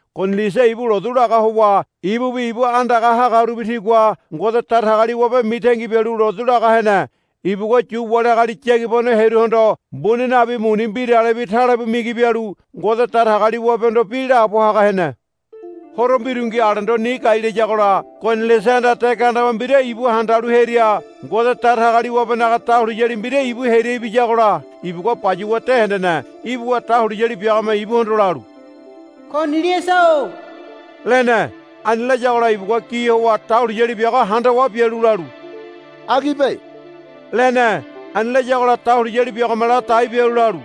Koniliasa ibu lotu laga howa ibubi ibu andagaha hagarubi tigua Ngode Datagaliwabe mitangi bialu lotu laga hene. Ibugua Yu wali agali yagibano hearuhondo mbuni nabi muni mbiralebi talebu migi bialu Ngode Datagaliwabehondo bi laabo haga hene. Horo mbirungi alendo ni gai layagola Koniliasahanda de gandeba mbira ibu handalu hearia Ngode Datagaliwabenaga dahuliyali mbira ibu hearia ibiyagola ibugua bayuwa de hendene. Ibuwa dahuliyali biagome ibuhondo lalu, Koniliasa-o, lene. Ani layagola ibugua gi howa dahuliyali biago handawa bialu lalu, Agibe, lene. Ani layagola dahuliyali biagome ladai bialu lalu,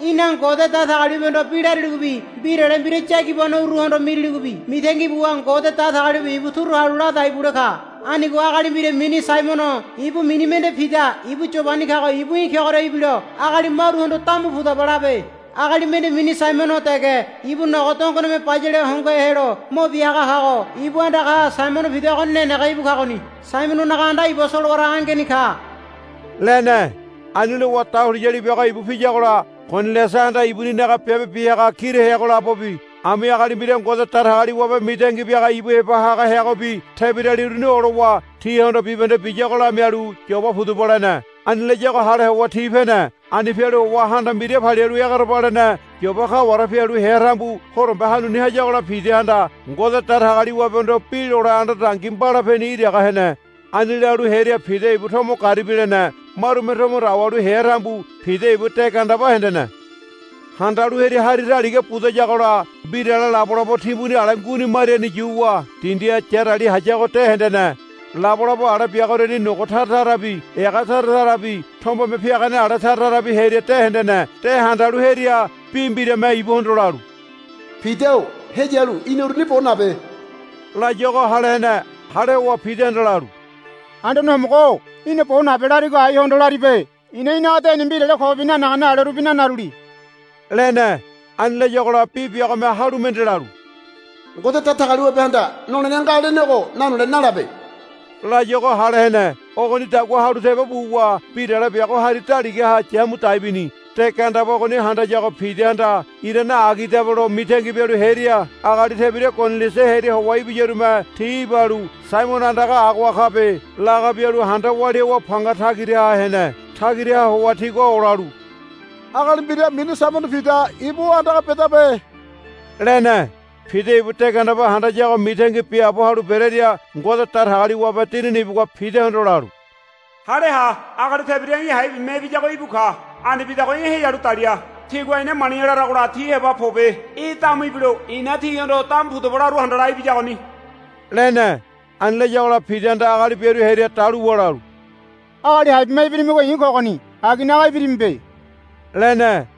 Í̠na Ngode Datagaliwabehondo bi lariligobi mbirale mbira yagibanoruhondo miriligobi mitangi buwa Ngode Datagaliwabe ibu turu halu ladai bule ka. Anigo agali mbira mini Saimono ibu mini mende Pida ibu Yobani kago ibu í̠ kegoria ibilo agali maruhondo, Damu pudaba, labe. Agali mende mini Saimono dege ibu nogo dongone bayale hongohe helo mo bia haga kago ibu andagaha Saimono Pida ogoni nenege íbu kagoni. Saimononaga anda iba solowara angeni ka, lene. Ani lowa dahuliyali biago ibu piyagola Koniliasahanda ibuninaga biabe bia haga kira heago labobi ami agali mbira Ngode Datagaliwabe mitangi biaga ibu heba haga heagobi tebirali uruni olowa tihondo bibahende biyago lamialu, Yoba pudaba, lene. Ani layago hale howa ti pene. Ani pialu howa ha anda mbira palialu egerebalene Yoba kaware pialu hea tambu horombe hanuni hayagola Pidahanda Ngode Datagaliwabehondo bi lole anda dangi mbalapeni iraga hene. Ani lalu hearia Pida ibu tomo garibi lene. Marume tomo dawalu hea tambu Pida ibu de gandeba hendene. Handalu hearia hari daliga budayagola mbirale labolabo timbuni ale nguini mariani yuwa dindiha yarali hayago de hendene. Labolabo ale biagoriani nogo tara tarabi ega tara tarabi tombeme piagane ale tara tarabi heneria de hendene. De handalu hearia bi mbirame ibuhondo lalu, Pida-o heyalu í̠na uruni bo nabe, layuago hale hene. Hale howa Pidahanda lalu, Anduane Homogo-o í̠na bo nabe larigo aihondo laribe. I̱na í̠naga deni mbirale kobi nanagane alerubi nanaruli, lene. Ani layagola bi biagome halu mende lalu, Ngode Datagaliwabehanda nolene nga lenego nanole nalabe, layuago hale hene. Ogonidagua halu tebo buwa mbirale biago hari daligaha yamu dai bini. De gandeba ogoni handayago Pidahanda irane agidabe lo mitangi bialu hearia agali tebira Koniliasa hearia howa ibiyarume ti ibalu, Saimono andaga agoha kabe, laga bialu handa walia howa panga tagiraha hene. Tagiraha howa tigua olalu, Agali mbira mini Saimono Pida ibu o andaga bedabe, lene. Pida ibu de gandeba handayago mitangi biaabo halu berearia Ngode Datagaliwabe Dinini ibugua Pidahondo lalu, Hale ha. Agali tebira í̠ hai bima ibiyago íbu ka. Ani bidago í̠ heyalu dalia. Tigua, Ina mali̱ya, laragola ti heba pobe. Í̠ damu ibilo i̱na tihondo damu pudaba laru handala ibiyagoni, lene. Ani layagola Pidahanda agali biaru hearia daluwa lalu, Agali hai bima ibirimigo i̱ kogoni. Aginaga ibirimibe, lene.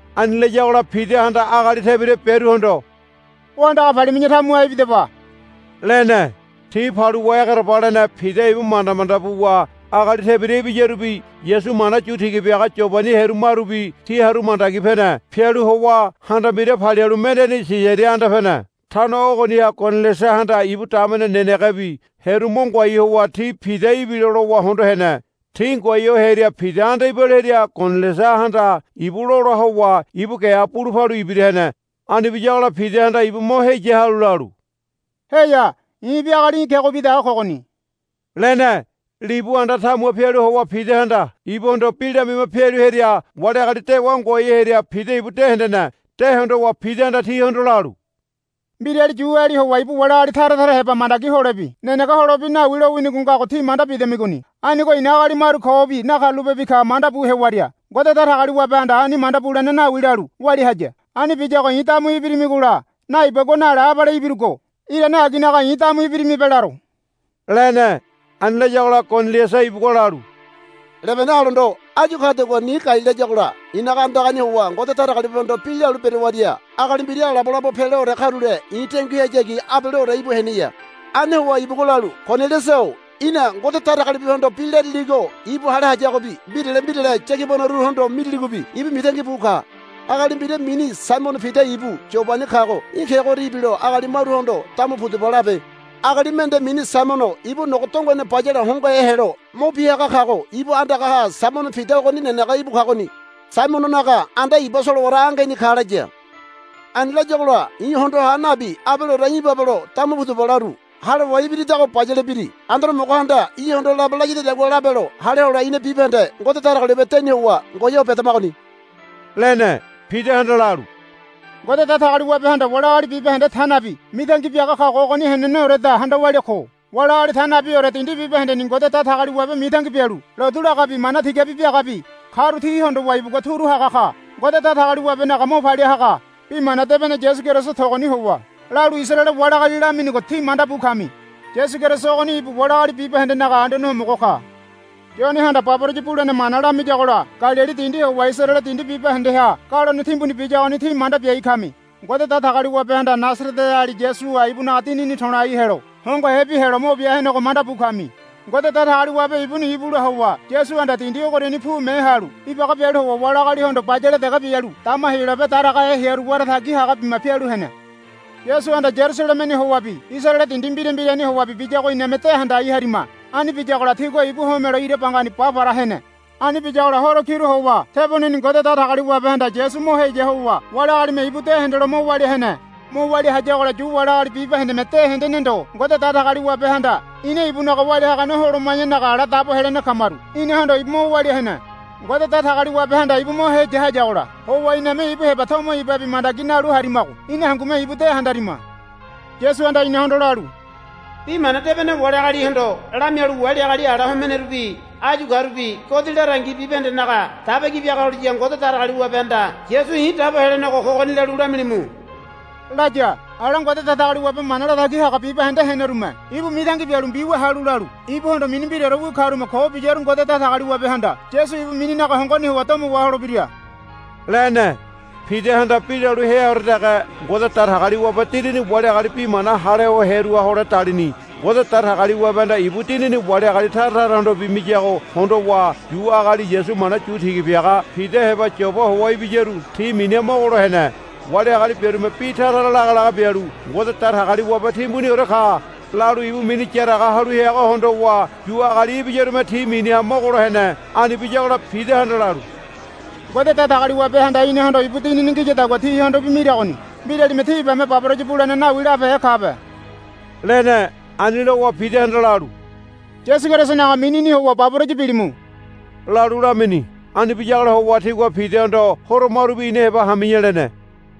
Ani layagola Pidahanda agali tebira biaruhondo, O andaga palimi̱ya tamuha ibidaba, lene. Ti paluwa egerebalene Pida ibu manda manda buwa agali tebira ibiyarubi Yasu mana yu tiga biaga Yobani hearu marubi ti haru mandagi pene. Pialu howa ha anda mbira palialu mendeni Sisaria anda pene. Tano ogoniha Koniliasahanda ibu damene nenegebi hearu mo ngoai howa ti Pida ibilo lowa hondo hene. Ti ngoai ho hearia Pida anda ibalu hearia Koniliasahanda ibu lola howa ibu geha bulu palu ibira hene. Ani biyagola Pidahanda ibu mo heya halu lalu, Heya. I̱bi agali í̠ kegobi dege kogoni, lene. Libu anda tamuha pialu howa Pidahanda ibuhondo bi lamima pialu hearia wali agali dewa ngoai ho hearia Pida ibu de hendene. De hondowa Pidahanda tihondo lalu, Mbirali Yuali howa ibu wali agali tara tara heba mandagi holebi nenege holebi nawi lowinigo ngago tí manda bidamigoni. Anigo i̱na agali maru kobi nakarulapebi ka mandabu hewaria Ngode Datagaliwabehanda ani manda bulene nawi lalu walia haya. Ani biyago i̱ damu ibirimigola, Naibagua, nale abale ibirugo. Irane aginaga i̱ damu ibirimibe laro, lene. Ani layagola Koniliasa ibugua lalu, Lebene alendo áyu kadagua ni gai layagola i̱naga andagani howa Ngode Datagaliwabehondo bi lalu berewaria agali mbira labolabo peleore karule i̱ denguihayagi abaleore íbu heneya. Ani howa ibugua lalu, Koniliasa-o í̠na Ngode Datagaliwabehondo bi lariligo ibu hale hayagobi mbirale mbirale yagibanoruhondo miriligobi ibu mitangi bu ka. Agali mbira mini Saimono Pida ibu Yobani kago í̠ kegoria ibilo agali maruhondo, Damu pudaba, labe. Agali mende mini Saimono ibu nogo dongone bayale hongohe helo mo bia haga kago ibu andagaha Saimono Pida ogoni nenege íbu kagoni. Saimononaga anda iba solowara angeni ka, laya. Ani layagola i̱ hondoha nabi abaleore í̠ ibabelo damu pudaba laru. Hale howa ibiridago bayale biri. Anduane Homogohanda í̠hondo labe layadadagua labelo hale hole ina bibahende Ngode Datagaliwabe deni howa ngoai ho bedamagoni, lene. Pidahanda lalu, Ngode Datagaliwabehanda wali agali bibahende ta nabi mitangi biaga kago ogoni heneneoreda handa walia ko. Wali agali ta nabiore dindi bibahendeni Ngode Datagaliwabe mitangi bialu lotu lagabi mana tigabi biagabi karu ti hondowa ibugua turu haga ka. Ngode Datagaliwabenaga mo palia haga Bi Mana Debene Yasu Keriso togoni howa lalu Isaraele wali agali laminigo tí manda bu kami. Yasu Keriso ogoni ibu wali agali bibahendenaga Anduane Homogo ka. Yonehanda baboraya bulene mana lamiyagola Galili dindi howa Isaraele dindi bibahendeha galone timbuni biyagoni tí manda biai kami. Ngode Datagaliwabehanda Nasareteali Yasuha ibunaga Dinini to̱lai helo hongohebi helo mo bia henego manda bu kami. Ngode Datagaliwabe ibuni ibula howa Yasuhanda dindi ogoriani pume halu ibaga bialu howa wali agalihondo bayale dege bialu dama Heyolabe daragahe hearu wara tagi haga bima pialu hene. Yasuhanda Yarusalemeni howabi Isaraele dindi mbira mbirani howabi biyago iname de handai harima. Ani biyagola tigua ibu homelo ira bangani ba para hene. Ani biyagola horo kiru howa teboneni Ngode Datagaliwabehanda Yasu mo heya howa wali agalime ibu de hendelo mo walia hene. Mo walia hayagola Yu wali agali bibahendeme de hendene ndo Ngode Datagaliwabehanda ina ibunaga walia hagane holoma̱yanaga ala dabo helene kamaru inahondo ibu mo walia hene. Ngode Datagaliwabehanda ibu mo heya hayagola howa iname ibu heba tomo ibabi mandagi nalu harimago ina hangume ibu de handarima. Yasuhanda inahondo lalu, Bi mana debene wali agalihondo lamialu wali agali ala homenerubi áyu karubi godi larangi bibahendenaga daba ki biaga holiya Ngode Datagaliwabehanda Yasu i̱ dabo helenego kogoni lalu lamilimu, laya. Ala Ngode Datagaliwabe mana latagi haga bibahende henerume ibu mitangi bialu mbiwia halu lalu, Ibuhondo mini mbiraorewi karume ko biyaru Ngode Datagaliwabehanda Yasu ibu mininaga hongoni howa domo waholebira, lene. Pidahanda bi lalu heaore dege Ngode Datagaliwabe Dinini wali agali bi mana hale ho hearuha hole dalini. Ngode Datagaliwabehanda ibu Dinini wali agali tara tarahondobi miyago hondowa Yu agali Yasu mana yu tiga biaga Pida heba Yoba howa ibiyaru ti miniha mogolo hene. Wali agali biarume bi tara lagalaga bialu, Ngode Datagaliwabe timbuniore ka, lalu ibu mini yaraga halu heago hondowa Yu agali ibiyarume ti miniha mogolo hene. Ani biyagola Pidahanda lalu, Ngode Datagaliwabehanda inahondo ibu Dinini ngiyadagua tihondobi miragoni. Mbiralime, Ti ibame baboraya bulene nawi, labehe kabe, lene. Ani lowa Pidahanda lalu, Yasu Kerisonaga minini howa baboraya bilimu, lalu lamini. Ani biyagola howa tigua Pidahondo, Horo marubi ina heba hami̱ya, lene.